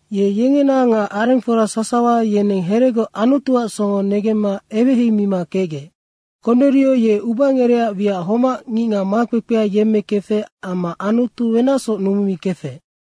Ye yengena nga arengfora sasawa, yeneng heregoc Anutuac songo negemma eweheimima kecgec. Konerio ye ubangereac wiac homac ngicngac makpekpea yemmekefec amma Anutu wenacsoc numumikefec.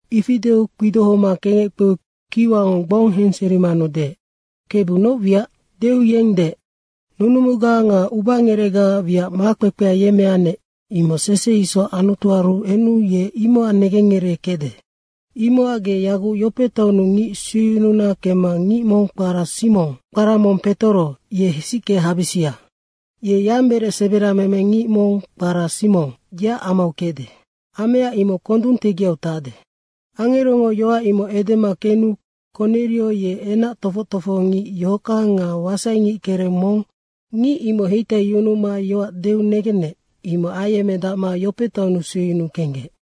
Ifi deu kpidohoma kengec kpeu kiwango gbong henserimanu deec, “Kebu noc wiac?” deu yeng deec, “Nunumuga nga ubangerecgaac wiac makpekpea yemmeannec, imoc sese isoc Anutuaru enu ye imocac negengngereekecde. Imocac ge yaguc Yope taonnu ngic sueyununa kemma ngic mong kpara Simong, kpara mong Petoro, ye hesicke habisia. Ye yamberec seberameme ngic mong kpara Simong, yeac amau kecde. Amea imoc kondung tegiau tacde.” Angerongo yoac imoc edema kenu Konerio ye enac tofoc tofohongic yohockang nga wasaingickereng mong, ngic imoc heitaiyunuma yoac deu negenec. Imoc ayemmedacma Yope taonnu sueyunuu kenggec.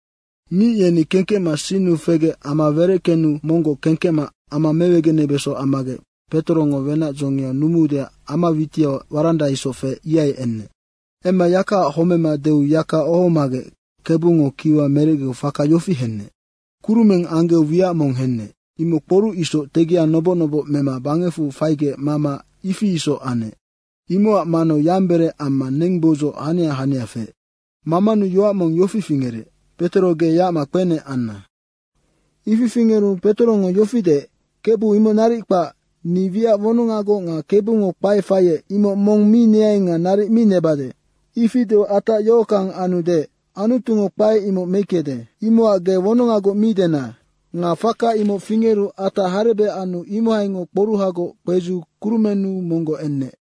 Ngic yeni kengkecma sinnu fegec ama wereckenu monggoc kengkecma ama mewegenebeso ammagec, Petorongo wenac dzongiau numuudeac ama witiau waranda isoc feec, ihai enec. Emma yakaac homema deu yaka ohomagec Kebungo kiwa merecgeu faka yofi henec: Kurumeng anggeu wiac mong henec. Imoc kporuc isoc tegia noboc noboc mema bangecfu faigec mama, ifi isoc anec. Imocac manau yamberec amma nengboudzoc hania hania feec. Mamanu yoac mong yofi fingerec, “Petoro ge yacma kpenec anna.” Ifi fingeru Petorongo yofi deec, “Kebu imoc naric kpac, ni wiac wonongagoc nga Kebungo kpae faiec, imoc mong mi neai nga naric mi nebade.” Ifi deu atac yohockang anu deec, “Anutungo kpae imoc meickede, imocac ge wonongagoc mi dena.” Nga faka imoc fingeru atac harebec anu imohaingoc kporuhagoc kpedziu kurumennu monggoc enec.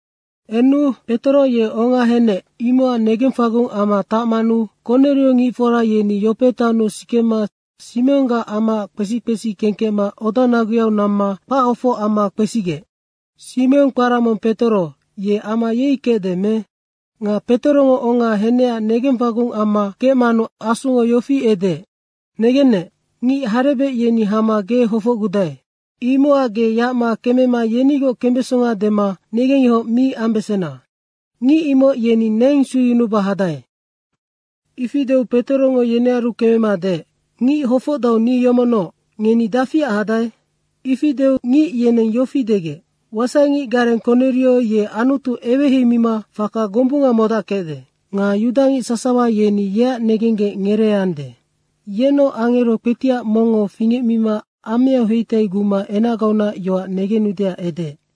Enu Petoro ye onga henec, imocac negengfagung amma tacmanu Konerio ngicfora yeni Yope taonnu sikema Simonggac amaac kpesi kpesi kengkecma odanaguyau namma kpachofoc amma kpesigec, “Simong kpara mong Petoro, ye ama yei kecde me?” Nga Petorongo onga henecac negengfagung amma kecmanu Asungo yofi edeec, “Negennec, ngic harebec yeni hama ge hofocgudae. Imocac ge yacma kemema yenigoc kembesonga dema negengyohoc mi ambesena. Ngic imoc yeni neng sueyunuba hadae.” Ifi deu Petorongo yenearu kemema deec, “Ngic hofocdau ni yomocnoc, ngeni dafiac hadae?” Ifi deu ngic yeneng yofi degec, “Wasaingic gareng Konerio ye Anutu eweheimima faka gombunga modackecde. Nga yudangic sasawa yeni yeac negenggec ngereeande, yenoc angero kpetiac mongngo fingecmima ameau heitaiguma enacgaunac yoac negenudeac edeec.”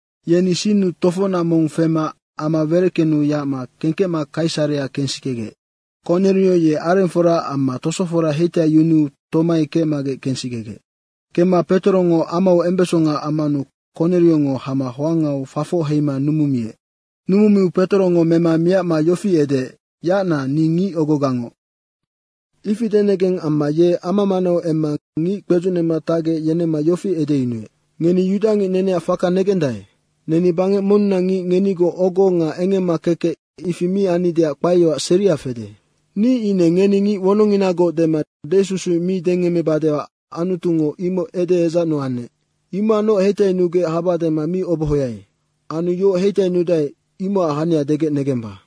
Yeni sinnu tofocnac mong fema ama wereckenu yacma kengkecma Kaisarea kensikegec. Konerio ye arengfora amma tosofora heitaiyunuu tomai kecmagec kensikegec. Kemma Petorongo amau embesonga ammanu Koneriongo hama hoangau fafoc heima numumiec. Numumiu Petorongo mema miacma yofi edeec, “Yacna ni ngicogogangoc.” Ifi denegeng amma ye ama manau emma ngic kpedzucnema tacgec, yenemma yofi edeyunuec. “Ngeni yudangic neneac faka negendae. Neni bangec monnunac ngic ngenigoc ogo nga engemma kekec ifi mi annideac kpaeyoac seria fede. Ni ine ngeni ngic wonongnginagoc dema desusuic mi dengemmebadeac Anutungo imoc edeedzacnu anec. Imocacnoc heitainugec haba dema mi obohoai. Anu yoc heitainudae, imocac hania degec negemba.”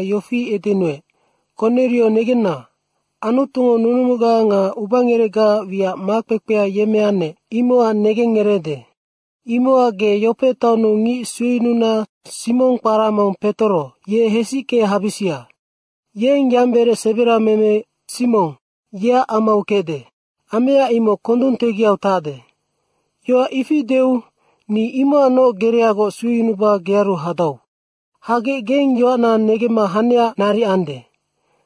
yofi edenuec, ‘Konerio negenna, Anutungo nunumuga nga ubangerecgaac wiac makpekpea yemmeannec, imocac negengngereede. Imocac ge Yope taonnu ngic sueyununa Simong kpara mong Petoro, ye hesicke habisia. Yeng yamberec seberameme Simong, yeac amau kecde. Amea imoc kondung tegiau tacde.’ Yoac ifi deu ni imocacnoc gereagoc sueyunuba gearu hadau. Hagec geng yoacna negemma hanecac naric ande.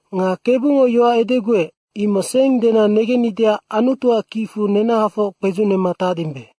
Nga Kebungo yoac edeguec, imoc seng dena negennideac Anutuac kicfu nenahafoc kpedzucnema tacdimbe.”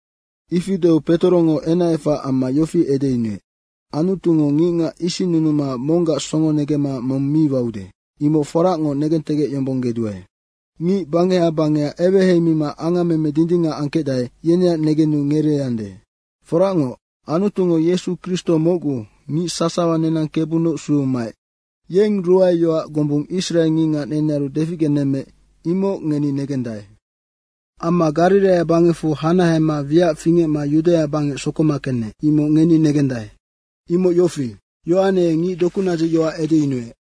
Ifi deu Petorongo enacefac amma yofi edeyunuec, “Anutungo ngicngac isinnunuma monggac songo negemma mong mi waude, imoc foracngoc negentegecyombonggeduae. Ngic bangeha bangeha eweheimima angammeme dindingac angkecdae, yeneac negenu ngereeande. Foracngoc, Anutungo Yesu Kristo mocgu, ngic sasawa nenang Kebunoc sueu maec. Yeng ruae yoac gombung israe ngicngac nenearu deficgenemmeec, imoc ngeni negendae. Amma Gariraia bangecfu hanahema wiac fingecma Yudaia bangec sokoma kenec, imoc ngeni negendae. Imoc yofi: Yohane ye ngic dokunadzicac yoac edeyunuec.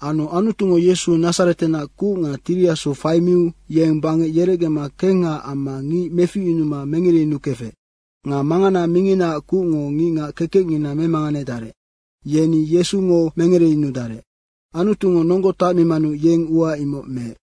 Anu Anutungo Yesu Nadzaretenac kuc nga Tiri Asu faimiu yeng bangec yerecgema kengha amma ngic meficyunuma mengereyunukefec nga mangana minginaac kucngo ngicngac kekecngina memanganedarec, yeni mengereyunudarec. Anutungo nonggo tacmimanu yeng ua imoc meec.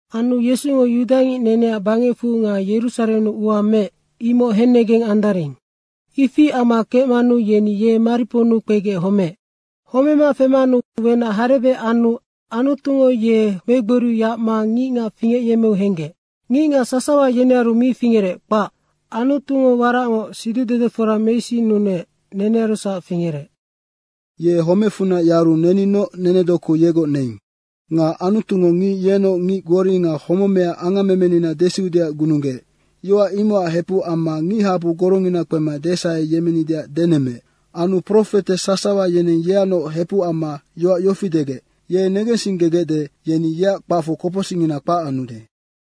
Anu Yesungo yudangic neneac bangecfu nga Yerusarennu ua meec, imoc hennegeng andaring. Ifi amma kecmanu yeni ye mariponnu kpegec homeec. Homema femanu wenac harebec anu Anutungo ye megboriu yacma ngicngac fingecyemmeu henggec. Ngicngac sasawa yenearu mi fingerec, kpac. Anutungo waracngoc siducdedefora meisinnunuec, nenearusac fingerec. Ye homecfunac yaru neninoc nenedoku yegoc neing. Nga Anutungo ngic yenoc ngic gbori nga homemea angammemenina desiudeac gununggeec, yoac imocac hepuc amma ngichabu gorongina kpema desaheyemmenideac denemmeec. Anu profete sasawa yeneng yeacnoc hepuc amma yoac yofi degec, ‘Ye negensinggegecde, yeni yeac kpacfu kopocsicngina kpac anude.’”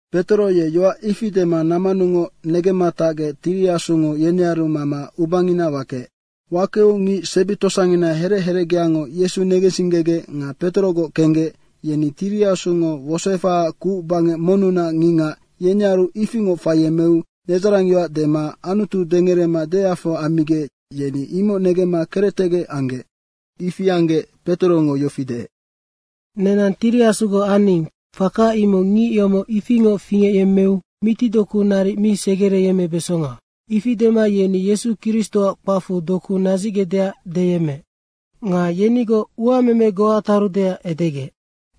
Petoro ye yoac ifi dema nammanungoc negemma tacgec Tiri Asungo yenearu mama ubangina wakeec. Wakeu ngic sebi tosangina herec herecgeango Yesu negensinggegec nga Petorogoc kenggec, yeni Tiri Asungo wosoefahaac kuc bangec monnunac ngicngac, yenearu ifingoc faiyemmeu nedzarangyoac dema Anutu dengerema deafehe ammigec, yeni imoc negemma kerectegec anggec. Ifi anggec Petorongo yofi deec, “Nenang Tiri Asugoc aning, faka imoc ngic yomoc ifingoc fingecyemmeu mitidoku naric mi segereyemmebesonga.” Ifi dema yeni Yesu Kristoac kpacfu doku nadzicgecdeac deyemmeec. Nga yenigoc uameme goa tarudeac edegec.